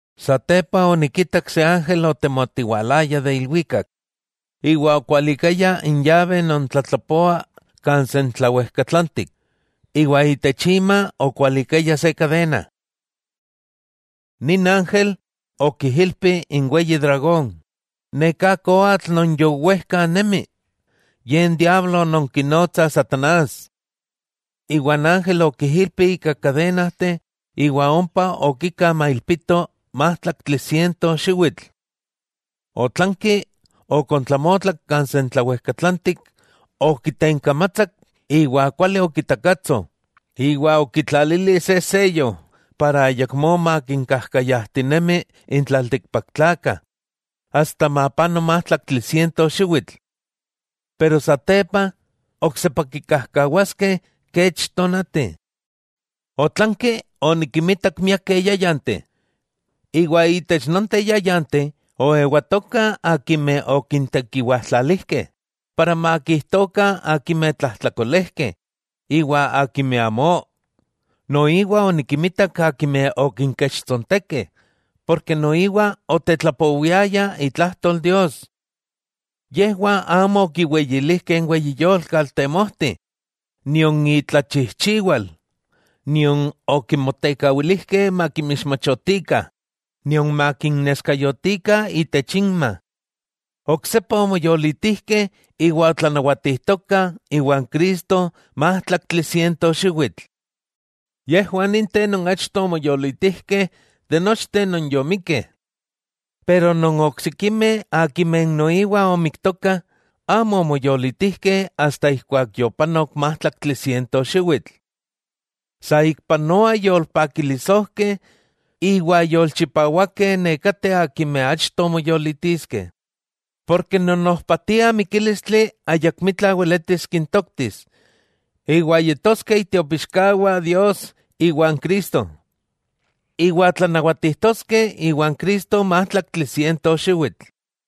Satepa onikitak se ángel otemotiwalaya de ilwikak iwa okualikaya n yabe non tlatlapoa kan sentlawejkatlantik, iwa itech ima okualikaya se kadena. Nin ángel okijilpi n weyi dragón, neká koatl non yowejka nemi, ye n diablo non kinotsa satanás. Iwa n ángel okijilpi ika kadenajteh iwa ompa okika mailpito májtlaktli siento xiwitl. Otlanki okontlamotlak kan sentlawejkatlantik, okitenkamatsak iwa kuali okitakatso iwa okitlalili se seyo ijkó ayakmó makinkajkayajtinemi n tlaltikpaktlakah asta mapano májtlaktli siento xiwitl. Pero satepa, oksepa kikajkawaskeh kech tonati. Otlanki onikimitak miakeh yáyanteh, iwa itech nonteh yáyanteh oewatokah akimeh okintekiwajtlalijkeh para makijtokah akimeh tlajtlakolejkeh iwa akimeh amó. Noiwa onikimitak akimeh okinkechtsontekeh ken noiwa otetlapowiayah itlajtol Dios. Yejwah amo okiweyilijkeh n weyi yolkatl temojti nion itlachijchiwal, nion okimotekawilijkeh makinmixmachotikah nion makinneskayotikah itech inma. Oksepa omoyolitijkeh iwa otlanawatijtokah iwan Cristo májtlaktli siento xiwitl. Yejwah ninteh non achto omoyolitijkeh de nochteh non yomikkeh. Iwa n oksikimeh akimeh noiwa omiktokah, amo omoyolitijkeh asta ijkuak yopanok májtlaktli siento xiwitl. ¡Saikpanoa yolpakilisojkeh iwa yolchipawakeh nekateh akimeh achto moyolitiskeh!, porke non ojpatia mikílistli ayakmitla weletis kintoktis. Iwa yetoskeh itiopixkawah Dios iwa n Cristo, iwa tlanawatijtoskeh iwan Cristo májtlaktli siento xiwitl.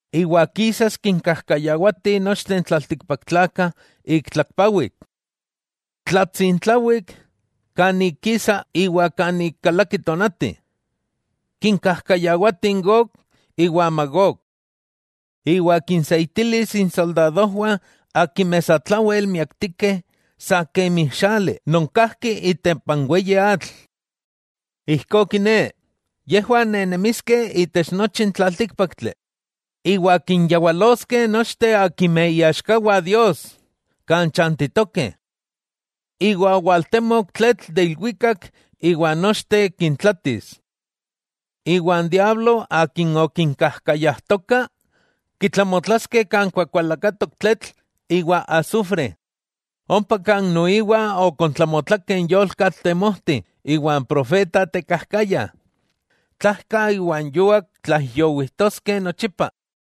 Iwa kisas kinkajkayawati nochteh n tlaltikpaktlakah ik tlakpawik, tlatsintlawik, kan ik kisa iwa kan ik kalaki tonati. Kinkajkayawati n Gog iwa n Magog. Iwa kinseitilis insoldadojwah non satlawel miaktikeh sa kemi xali non kajki itempa n weyi atl. Ijkó kiné, yejwah nenemiskeh itech nochi n tlaltíkpaktli, iwa kinyawaloskeh nochteh akimeh iaxkawah Dios kan chantitokeh. Iwa owaltemok tletl de ilwikak iwa nochteh kintlatis. Iwa n diablo akin okinkajkayajtoka, kitlamotlaskeh kan kuakualakatok tletl iwa asufre, ompa kan noiwa okontlamotlakeh n yolkatl temojti iwa n profeta tekajkaya. Tlajka iwa n yuak tlaijyowijtoskeh nochipa.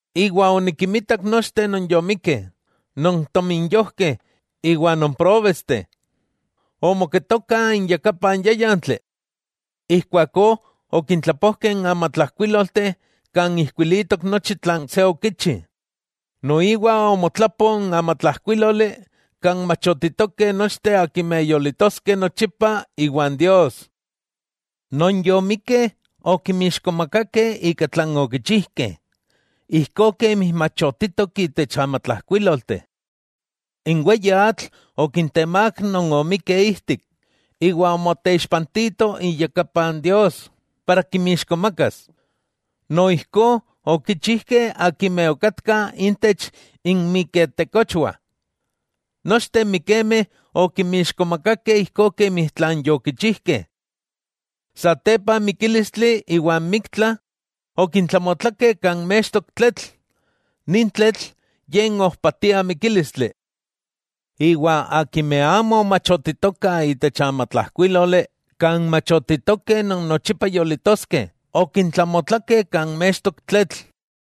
Iwa onikinmitak nochteh non yomikkeh, non tominyojkeh iwa non próbesteh, omoketokah iyakapan n yáyantli. Ijkuakó okintlapojkeh n amatlajkuílolteh kan ijkuilitok nochi tlan se okichi. Noiwa omotlapo n amatlajkuíloli kan machotitokeh nochteh akimeh yolitoskeh nochipa iwan Dios. Non yomikkeh okinmixkomakakeh ika tlan okichijkeh ijkó kemi machotitok itech amatlajkuílolteh. N weyi atl okintemák non omikkeh ijtik, iwa omoteixpantito iyakapa n Dios para kinmixkomakas, noijkó okichijkeh akimeh okatkah intech inmiketekochwah. Nochteh n mikemeh okinmixkomakakeh ijkó kemi yokichijkeh. Satepa n mikílistli iwa n miktla, okintlamotlakeh kan mextok tletl. Nin tletl ye n ojpatia mikílistli. Iwa akin amo omachotitoka itech n amatlajkuíloli kan machotitokeh non nochipa yolitoskeh, okintlamotlakeh kan mextok tletl.